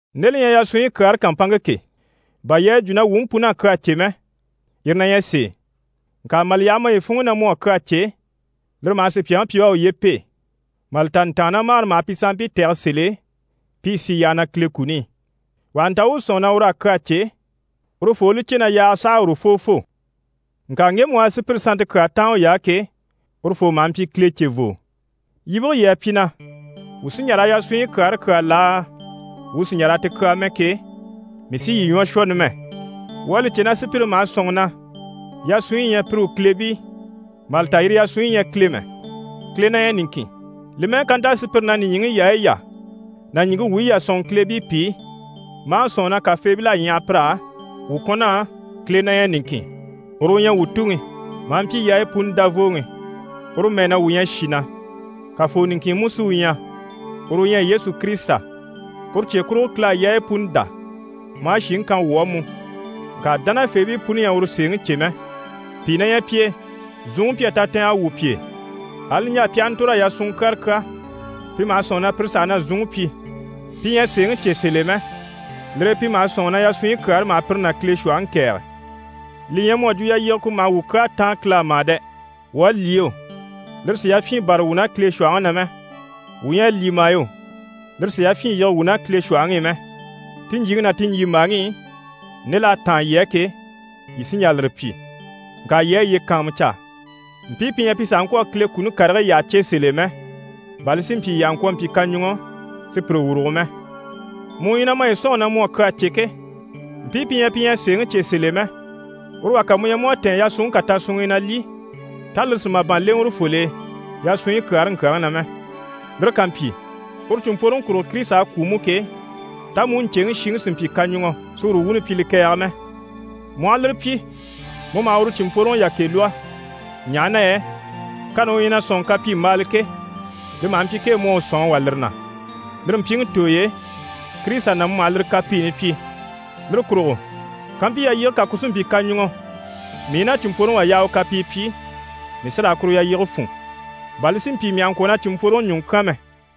Nde li ɲyɛ yasunɲyi kyaare kàmpanŋke ke, bà yii à yi jwo na wuu mú pun'à kyaa cè mɛ, yire na ɲyɛ sèe. Ŋka mà li yaha maye funŋ'i na mu à kyaa cè, lire maha sùpyaŋi pyi u à uye pêe. Mà li ta ntàannamagare maha pi sanmpii tɛ̀gɛ sèl'e pi i sì yyaha na Kile kuni i. Wà ha nta u u sɔ̂nŋi na ur'à kyaa cè, urufoo u li cè na yaaga saha a urufoo fô. Ŋka ŋgemu u à sùpyire sannte kyaa táan uy'á ke, urufoo maha mpyi Kile cevoo. Yibige yii à pyi na: «wuu sí n‑jà raa yasunɲyi kyaare kyàa laa, wuu sì n‑jà raa ti kyàa mɛ?» ke, mii sí yii ɲwɔ shwɔ numɛ. Wuu à li cè na sùpyire maha sɔ̂nŋi na yasunɲyi yi ɲyɛ pire u kileebii mà li ta yire yasunɲyi ɲyɛ Kile mɛ, Kile na ɲyɛ niŋkin. Li mɛ́ɛ ká nta sùpyire na nìɲyiŋi yaayi yà ná ɲìŋke wuyi yà sɔ̂nŋi kileebii pìi, maa sɔ̂nŋi na kafeebil'à ɲyaha pir'á, wuu kɔn'á, Kile na ɲyɛ niŋkin, uru u ɲyɛ wuu Tuŋi, maa mpyi yaayi puni Davooŋi, uru mɛɛ na wuu ɲyɛ shì na. Kafoo niŋkin mú sí u ɲyɛ, uru u ɲyɛ Yesu Kirisita. Uru cye kurugo, Kile à yaayi puni dá maa shìŋi kan wuu á mú. Ŋka dánafeebii puni ɲyɛ a uru sèeŋi cè mɛ. Pìi na ɲyɛ pi e, zunŋi mpyi a tatɛɛngɛ wwû pi e, ali niɲjaa pi aha ntòr'a yasunŋɔ kyara kyà, pi maha sɔ̂nŋi na pire saha na zunŋi pyi. Pi ɲyɛ a sèeŋi cè sèl'e mɛ, lire e pi maha sɔ̂nŋi na yasunɲyi kyaare maha pire ná Kile shwɔ̀hɔŋi kɛ̀ɛge. Li ɲyɛ mu à jwo yalyige ku maha wuu kyaa táan Kile á mà dɛ! Wuu à lyî yo, lire sì yafyin bâra wuu ná Kile shwɔ̀hɔŋi na mɛ. Wuu ɲyɛ a lyî mà yo, lire sì yafyin yige wuu ná Kile shwɔ̀hɔŋi i mɛ. Ti ɲjyìŋi ná ti ɲjyìmbaaŋi i, nde l'à táan yii á ke, yii sí n‑jà lire pyi. Ŋka yii a yiye kàanmucaa, mpii pi ɲyɛ pi sàha ŋkwɔ̀ a Kile kuni karigii yyaha cè sèl'e mɛ, bà li si mpyi yii àha mpyi kaɲuŋɔ si pire wurugo mɛ. Mu u ɲyɛ na maye sɔ̂nŋi na mu à kyaa cè ke, mpii pi ɲyɛ pi ɲyɛ a sèeŋi cè sèl'e mɛ, uru wà ká mu ɲya mu à tɛ̀ɛn yasunŋke kà tasunŋ'i na lyî, tá lire sì màban lèŋɛ urufol'e yasunɲyi kyaare ŋkyàŋi na mɛ? Lire ká mpyi, uru cìnmpworoŋi kurugo Kirisita à kwû mú ke, tá mu u ɲcèŋi shiŋi sì n‑pyi kaɲuŋɔ si uru wuuni pyi li kɛ̀ɛge mɛ? Mu aha lire pyi, mu maha uru cìnmpworoŋi yakɛ lwɔ́, ɲaha na yɛ kani u ɲyɛ na sɔ̂nŋi kapyimbaala ke, li maha mpyi kee mu à u sɔ̀n a wà lire na. Lire mpyiŋi tooy'e, Kirisita na mu maha lire kapiini pyi. Lire kurugo kampyi yalyige kà ku sí n‑pyi kaɲuŋɔ mii i na cìnmpworoŋi wà yaha u kapii pyi, mii sí raa kuru yalyige fún, bà li si mpyi mii àha ŋkwɔ̀ na cìnmpworoŋi ɲùŋɔ kyán mɛ.